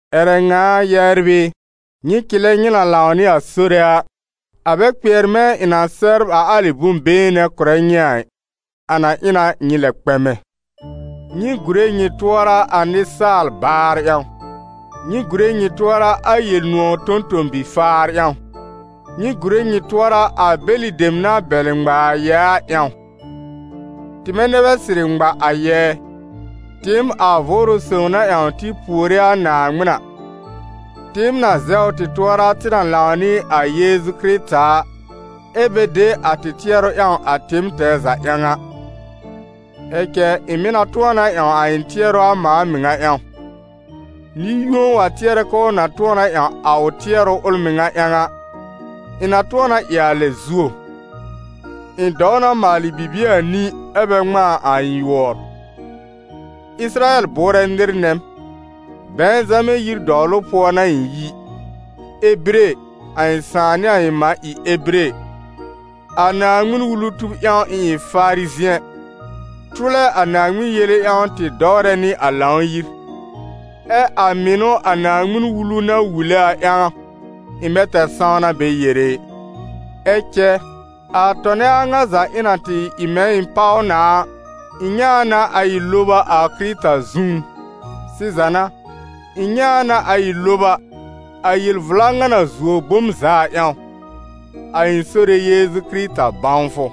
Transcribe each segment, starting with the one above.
Ƴɛrɛ ŋa a, yɛbr ɩ, nyɩ cɩlɛ nyɩ na lãw nɩ a Sore a. A bɛ kpɩɛr mɛ̃ ɩ̃ na sɛbr a alɩ bʋ̃-been nɛ kʋ̀rɛ nyɩ a ɩ, a na ɩ na nyɩ lɛ kpɛmɛ. Nyɩ gùre nyɩ tʋɔra a nɩsaal-baar ƴãw! Nyɩ gùre nyɩ tʋɔra a Yel-nʋ̃ɔ̀ tõ-tõ-bi-faar ƴãw! Nyɩ gùre nyɩ tʋɔra a bɛlɩ dem na bɛlɩ ŋma a yɛɛ a ƴãw! Tɩmɛ nɛ bɛ sɩrɩ ŋma a yɛɛ, tɩɩm a Vʋʋrʋ sõw na ƴãw tɩ puore a Naaŋmɩn a, tɩɩm na zɛwr tɩ tʋɔra tɩ na lãw nɩ a Yeezu Kɩrɩta a, ɛ́ bɛ de a tɩ tɩɛrʋ ƴãw a tɩɩm tɛɛ za ƴãw a. Ɛ cɛ ɩ̃ mɩ̀ na tʋ̃ɔ na ƴãw a ɩ̃ tɩɛrʋ a mãa mɩŋa ƴãw. Nɩ-yũo wa tɩɛrɛ k'ʋʋ na tʋ̃ɔ na ƴãw a ʋ tɩɛrʋ ʋl mɩŋa ƴãw a, ɩ̃ na tʋ̃ɔ na ɩ a lɛ zuo. Ɩ̃ dɔw na maalɩ bibie anĩ, ɛ́ bɛ ŋmãa a ɩ̃ yʋɔr; Ɩsɩrayɛl bʋʋrɛ nɩr nɛ m, Bɛ̃zamɛ yir dɔwlʋ pʋɔ n'a ɩ̃ yi, Ebire, a ɩ̃ sãà nɩ ɩ̃ mã ɩ Ebire; a Naaŋmɩn-Wulu tub ƴãw ɩ̃ ɩ Farizɩ̃ɛ, tʋlɛ a Naaŋmɩn yele ƴãw tɩ dɔwrɛ nɩ a Lãw-yir; ɛ a mɩnʋ a Naaŋmɩn-Wulu na wule a ƴãw, ɩ̃ bɛ tɛr sãwna bɛ yere ɩ. Ɛ cɛ, a tɔnɛ a ŋa za ɩ̃ na tɩ ɩ mɛ̃ ɩ̃ páw na a, ɩ̃ nyɛ̃ a na a ɩ loba a Kɩrɩta zũú. Sɩza n'a, ɩ̃ nyɛ̃ a na a ɩ loba, a yel-vla ŋa na zuo bom za a ƴãw: a ɩ̃ Sore Yeezu Kɩrɩta bãwfʋ.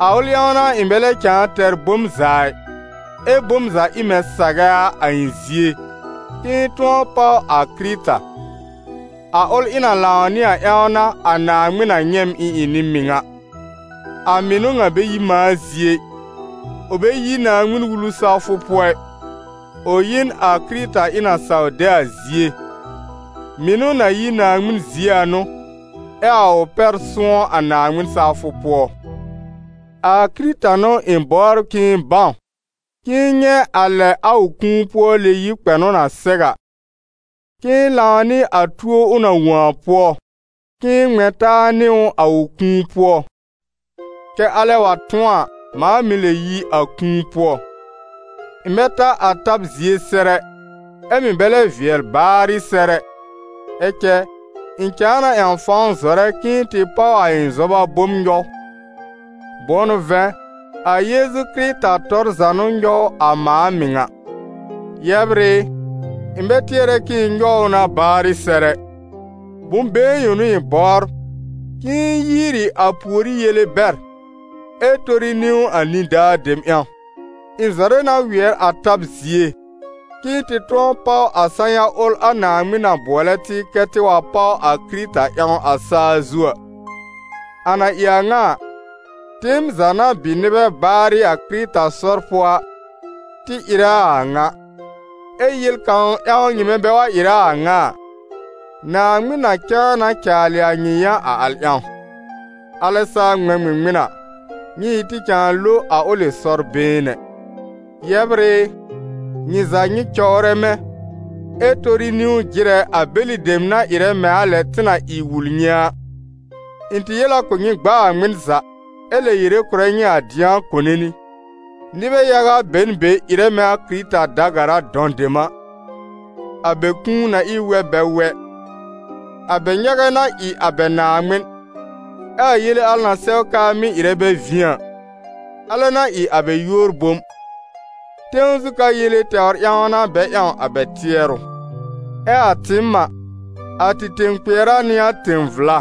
A ʋl ƴãw n'a ɩ̃ bɛ lɛ cãa tɛr bom za ɩ, ɛ bom za ɩ mɛ̃ sagɛ a, a ɩ̃ zie, k'ɩ̃ɩ tʋ̃ɔ páw a Kɩrɩta; a ʋl ɩ̃ na lãw nɩ a ƴãw n'a a Naaŋmɩn na nyɛ̃ m ɩ̃ ɩ nɩ-mɩŋa. A mɩnʋ ŋa bɛ yi mãa zie ɩ, ʋ bɛ yi Naaŋmɩn-Wulu sawfʋ pʋɔ ɩ, ʋ yi n a Kɩrɩta ɩ̃ na saw de a zie; mɩnʋ na yi Naaŋmɩn zie a n'ʋ, ɛ a ʋ pɛr sʋ̃ɔ́ a Naaŋmɩn sawfʋ pʋɔ. A Kɩrɩta n'ʋ ɩ̃ bɔbr k'ɩ̃ɩ bãw, k'ɩ̃ɩ nyɛ̃ a lɛ a ʋ kũu-pʋɔ-lɛ-yib kpɛnʋ na sɛw a, k'ɩ̃ɩ lãw nɩ a tuo ʋ na wõ a pʋɔ, k'ɩ̃ɩ ŋmɛ̃ taa nɩ a ʋ kũu-pʋɔ, kɛ̀ alɛ wa tʋ̃ɔ a, mãa mɩ̀ lɛb yi a kũu pʋɔ. Ɩ̃ bɛ ta a tab zie sɛr ɛ, ɛ mɩ̀ bɛ lɛ vɩɛl baarɩ sɛr ɛ; ɛ cɛ, ɩ̃ cãa na ƴãw fãw zɔrɛ k'ɩ̃ɩ tɩ páw a ɩ̃ zɔba bom nyɔw, bʋ̃ʋ n'ʋ vɛ̃, a Yeezu Kɩrɩta tɔr za n'ʋ nyɔw a mãa mɩŋa. Yɛbr ɩ, ɩ̃ bɛ tɩɛrɛ k'ɩ̃ɩ nyɔw ʋ na baarɩ sɛr ɛ. Bʋ̃-been yõ n'ʋ ɩ̃ bɔbr: k'ɩ̃ɩ yiiri a pùorí yele bɛr, ɛ tori niwn a nidaa dem ƴãw; ɩ̃ zɔrɛ na wɩɛr a tab zie, k'ɩ̃ɩ tɩ tʋ̃ɔ páw a sã-ya ʋl a Naaŋmɩn na bʋɔlɛ tɩ kɛ tɩ wa páw a Kɩrɩta ƴãw a sa-zu a. A na ɩ a ŋa a, tɩɩm za na bɩ nɩbɛ baarɩ a Kɩrɩta sɔr pʋɔ a, tɩ ɩrɛ a a ŋa; ɛ́ yel kãw ƴãw nyɩmɛ bɛ wa ɩrɛ a a ŋa a, Naaŋmɩn na cãa na caalɩ a nyɩ yã a al ƴãw. Alɛ saa ŋmɛ̃ ŋmɩŋmɩn a, nyɩ ɩ tɩ cãa lo a ʋlɩ sɔr-been nɛ. Yɛbr ɩ, nyɩ za nyɩ cɔwrɛ mɛ̃, ɛ tori niwn jɩrɛ a bɛlɩ dem na ɩrɛ mɛ̃ a lɛ tɩ na ɩ wul nyɩ a. Ɩ̃ tɩ yel a kʋ̀ nyɩ gb'aa ŋmɩn za, ɛ lɛ yere kʋ̀rɛ nyɩ a dɩ̃a kone nɩ, nɩbɛ yaga be n be ɩrɛ mɛ̃ a Kɩrɩta da-gara dɔ̃ dem a. A bɛ kũu na ɩ n wɛb bɛ wɛ; a bɛ nyagɛ n'a ɩ a bɛ Naaŋmɩn, ɛ a yele na sɛw k'aa mɩ́ ɩrɛ bɛ vĩ a, alɛ n'a ɩ a bɛ yúor bom, tẽw zu ka yele tɛwr ƴãw n'a bɛ ƴãw a bɛ tɩɛrʋ. Ɛ a tɩɩm a, a tɩ tẽ-kpɩɛra n'ɩ a tẽ-vla,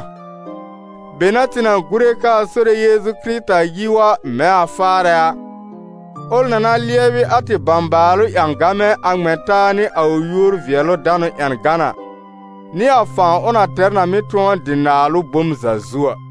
be n'a tɩ gùre k'aa Sore Yeezu Kɩrɩta yi wa mɛ̃ a faarɛ a, ʋl na na lɩɛbɩ a tɩ bãbaalʋ ƴãgamɛ a ŋmɛ̃ taa nɩ a ʋ yúor-vɩɛlʋ-danʋ ƴãgan a, nɩ a fãw ʋ na tɛr na mɩ́ tʋ̃ɔ dɩ naalʋ bom za zu a.